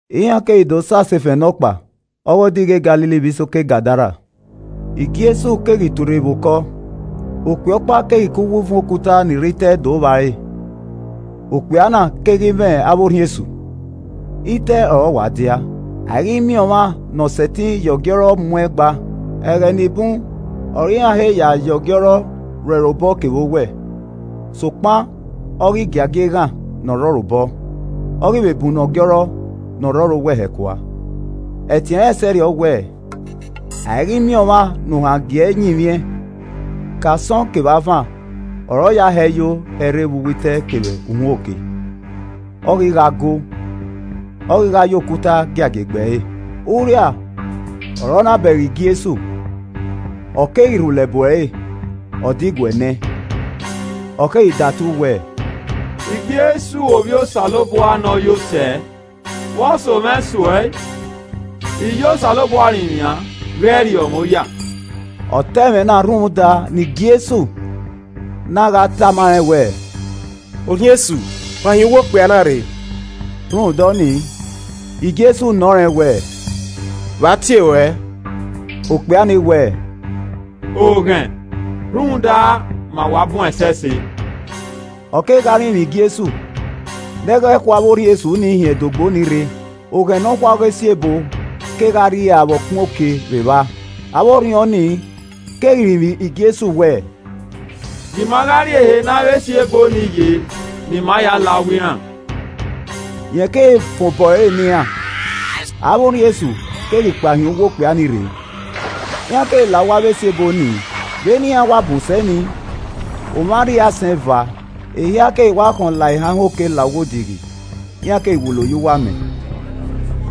Iran keghi do sẹ asefẹn nọkpa ọghe odighi e Galili vbe isoko Gadara. Jesu ghi tuorre vbe okọ, okpia ọkpa keghi ke uwu uvun okuta ni rre itẹ do vba ẹre. Okpia na keghi mwẹ avbe orhiọn esu. Itẹ ọre ọ wa dia. A i ghi miẹn ọmwa ne ọ sẹtin ya ọgiọrọ mu ẹn gba. Ẹghẹ ni bun ọre iran he ya ye ọgiọrọ rro ẹre obọ kevbe owẹ, sokpan ọ ghi giagia eghan ne ọ rre ọre obọ, ọ ghi vbe bunnọ ọgiọrọ ne ọ rre ẹre owẹ hẹ kua. Ẹtin ẹnrẹn sẹrriọ wẹ, a i ghi miẹn ọmwa ne ohan gie ẹe yinmwiẹn. Ke asọn kevbe avan, ọre ọ ya hẹ yo yẹ rre vbe uwu itẹ kevbe uhunmwu oke, ọ ghi gha goo, ọ ghi gha ya okuta giagia egbe ẹre. Urria ọre ọ na bẹghe Jesu, ọ keghi rhulẹ bu ẹre, ọ diguẹ nẹ ẹn. Ọ keghi datu wẹẹ, “Jesu Ovbi Osanobua Ne Ọ Yo Sẹ, vbe ọ so mwẹ so uẹ? I ya Osanobua rinmwian, ghẹ rriọ mwẹ oya.” ( Ọ ta ẹmwẹ na rhunmwuda ne Jesu na gha tama rẹn wẹẹ, “Orhiọn esu, kpa hin uwu okpia na rre.”) Rhunmwuda ọnii, Jesu nọ rẹn wẹẹ, “Vbe a tie ruẹ?” Okpia ni wẹẹ, “Oghẹn, rhunmwuda ma wa bun ẹsẹse.” Ọ keghi gha rinmwian Jesu ne ọ ghẹ khu avbe orhiọn esu ni hin ẹdogbo ni rre. Oghẹn nọkhua ọghe esi ebo kegha rria vbe ọkpẹn oke vbe evba. Avbe orhiọn ni keghi rinmwian Jesu wẹẹ, “Gie ima gha rrie ehe ne avbe esi ebo ni ye ne ima ya la uwu iran.” Rẹn keghi fan obọ ẹre ne iran. Avbe orhiọn esu keghi kpao hin uwu okpia nii rre, iran keghi la uwu avbe esi ebo nii. Vbene iran wa bun sẹ nii, omwa arriaisẹn eva, ehia keghi wa khọn la ehanhan oke la uwu odighi, iran keghi wulo ye uwu amẹ.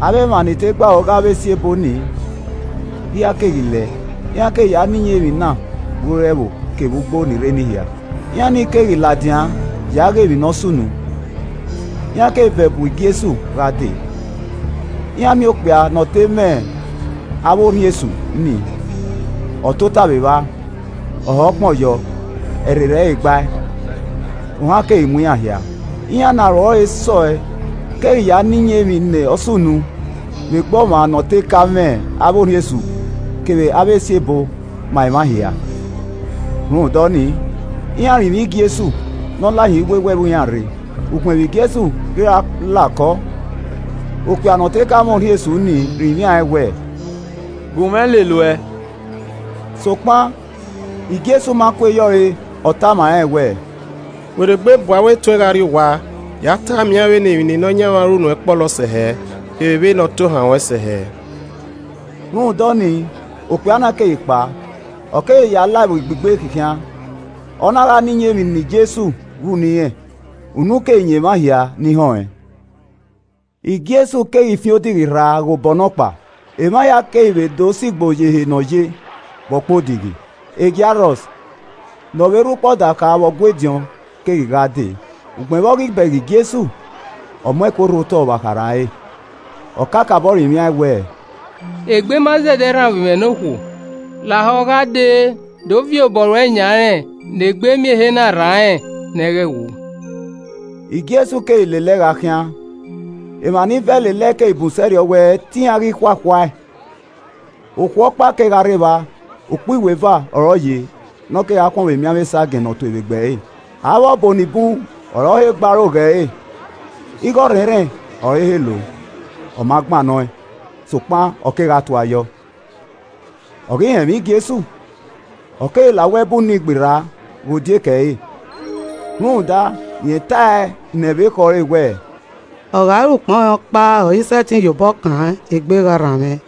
Avbe emwa ni te gbe aro ghe avbe esi ebo nii hia keghi lẹẹ, iran keghi ya na iyẹn emwi na vbe ore ẹvbo kevbe ugbo ni rre enii hia. Iran ni keghi ladian ya ghe emwi ne ọ sunu. Iran keghi vẹ bu Jesu gha dee, iran miẹn okpia ne ọ te ka mwẹ avbe orhiọn esu nii, ọ tota vbe evba, ọ hẹ ukpọn yọ, ẹrherhe ẹre gbae, ohan keghi mu iran hia. Iran ne aro ẹre sẹ ọe keghi ya na iyẹn emwi ne ọ sunu vbe egbe ọmwa ne ọ te ka mwẹ avbe orhiọn esu kevbe avbe esi ebo ma emwa hia. Rhunmwuda ọnii, iran rinmwian Jesu ne ọ la hin iwewe ẹvbo iran rre. Ugbẹn vbe Jesu ghi ra la okọ, okpia ne ọ te ka mwẹ orhiọn esu ni rinmwian ẹn wẹẹ, “Gun mwẹ lele uẹ.” Sokpan Jesu ma kue ye ọre re, ọ tama rẹn wẹẹ, “werriegbe bu avbe etuẹn gha rrie owa, ya tama iran vbene emwi ne Nọyaẹnmwa ru nuẹn kpọlọ sẹ hẹ, kevbe vbene ọ tohan ruẹn sẹ hẹ.” Rhunmwuda ọnii, okpia na keghi kpao, ọ keghi ya la Ẹvbo Igbe khinkhian, ọ na gha na iyẹn emwi ne Jesu ru ne irẹn, unu keghi yan emwa hia ni họn ẹn. Jesu keghi fian odighi rra ghe obọ nọkpa. Emwa hia keghi vbe do sigbo ye ehe ne ọ ye vbe ọkpẹn odighi. Jairọs, ne ọ vbe rre ukpo ọdakha vbe Ọgua ediọn keghi gha dee, ugbẹn vbe ọ ghi bẹghe Jesu, ọ mu ẹko rhu otọ vbe akharha ẹre. Ọ kakabọ rinmwian ẹn wẹẹ, “Egbe ma zẹdẹ rran ovbi mwẹ ne okhuo. Lahọ gha dee do viọ obọ ruẹ yan rẹn ne egbe miẹn ehe na rran rẹn ne ọ ghẹ wu.” Jesu keghi lele ẹe gha khian. Emwa ni vẹ lele ẹe keghi bun sẹrriọ wẹ te iran ghi khuakhua ẹe. Okhuo ọkpa kegha rre evba, ukpo iweva ọre ọ ye ne ọ kegha khuọnmwi emianmwẹ esagiẹn ne ọ tue vbe egbe ẹre. Avbe ọbo ni bun ọre ọ he gbe aro ghe ẹre, igho ọrhẹnrhẹn ọre ọ he lo, ọ ma gbannọ ẹn sokpan ọ kegha tua yọ. Ọ ghi họn ẹmwẹ Jesu, ọ keghi la uwu ẹbu nii gberra ghe odieke ẹre, rhunmwuda rẹn tae nẹ vbe uwu ekhọe ẹre wẹẹ, “Ọ gha re ukpọn rẹn ọkpa ọre I sẹtin ya obọ kan, egbe gha rran mwẹ.”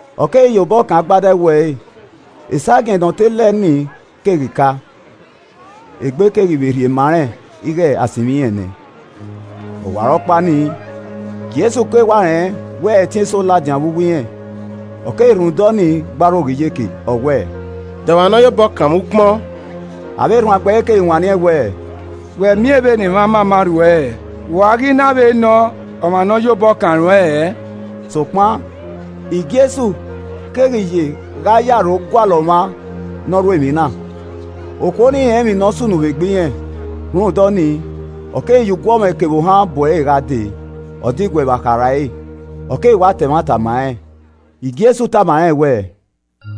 Ọ keghi ya obọ kan agbada ẹwu ẹre, esagiẹn ne ọ te lẹ ni keghi ka, egbe keghi vbe rhie ma rẹn ighe a sinmwi irẹn nẹ. Ọwarọkpa nii, Jesu keghi wa rẹn wẹ ẹtin eso ladian vbe uwu irẹn, ọ keghi rhunmwuda ọnii, gbe aro ghe iyeke, ọ wẹẹ “De ọmwa ne ọ ya obọ kan mwẹ ukpọn?” Avbe erhuanegbe ẹre keghi wanniẹn wẹẹ, “Wẹ miẹn vbene emwa mama rhu uẹ hẹ, vbe u a ghi na vbe nọ ọmwa ne ọ ye ohọ kan ruẹn hẹẹ?” Sokpan Jesu keghi ye gha ye aro gualọ ọmwa ne ọ ru emwi na. Okhuo nii rẹn emwi ne ọ sunu vbe egbe irẹn, rhunmwuda ọnii, ọ keghi ya uguọmwẹ kevbe ohan bu ẹre gha dee, ọ diguẹ vbe akharha ẹre, ọ keghi wa ta ẹmwata ma rẹn. Jesu tama rẹn wẹẹ,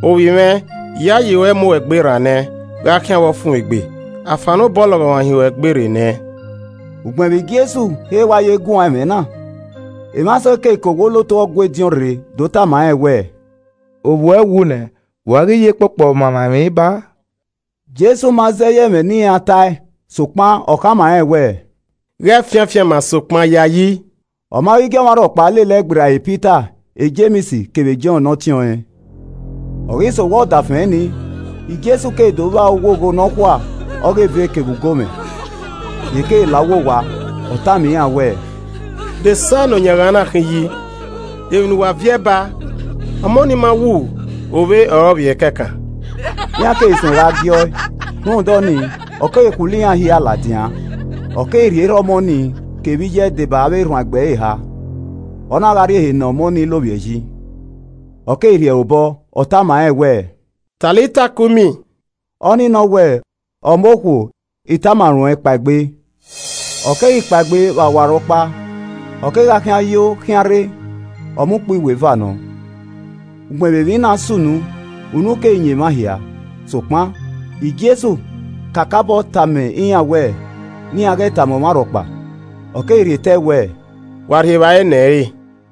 “Ovbi mwẹ, iyayi ruẹ mu uẹn egbe rran nẹ. Gha khian vbe ọfumwegbe, a fannọ obọ ọlọghọmwa hin ruẹn egbe rre nẹ.” Ugbẹn vbe Jesu he wa ye guan ẹmwẹ na, emwa eso ke owa olotu Ọgua ediọn rre do tama rẹn wẹẹ, “Ovbuẹ wu nẹ, vbe u a ghi ye kpokpo Ọmamwaemwi ba a?” Jesu ma zẹ ye ẹmwẹ ne iran tae sokpan ọ khama rẹn wẹẹ, “Ghẹ fian afianma, sokpan yayi.” Ọ ma ghi gie ọmwa rhọkpa lele ẹe gberra Pita, Jems kevbe Jọn ne ọtẹn ọnrẹn. Ọ ghi sẹ owa ọdafẹn nii, Jesu keghi do vba owogho nọkhua ọghe eve kevbe ugomwẹ. Rẹn keghi la uwu owa, ọ tama iran wẹẹ, “De esa ne oyanghan na khin yi! Demwi ne uwa viẹ ba? Ọmọ nii ma wu, ovbe ọre ọ vbiẹ kẹkan.” Iran keghi suẹn gha giẹ ọe: rhunmwuda ọnii ọ keghi khulo iran hia ladian, ọ keghi rhie erha ọmọ nii kevbe iye ẹe deba avbe erhuanegbe ẹre eha, ọ na gha rrie ehe ne ọmọ ni lovbiẹ yi. Ọ keghi rhie ẹre obọ, ọ tama rẹn wẹẹ, “Talita, koum” ọ nii nọ wẹẹ, “Ọmọ okhuo, I tama ruẹn, kpaegbe!” Ọ keghi kpaegbe vbe ọwarọkpa, ọ kegha khian yo khian rre. (Ọmọ ukpo iweva nọ.) Ugbẹn vbe emwi na sunu, unu keghi yan emwa hia. Sokpan Jesu kakabọ tama iran wẹ ne iran ghẹ tama ọmwa rhọkpa. Ọ keghi rhie tẹe wẹẹ, “Wa rhie evbare nẹ ẹn re.”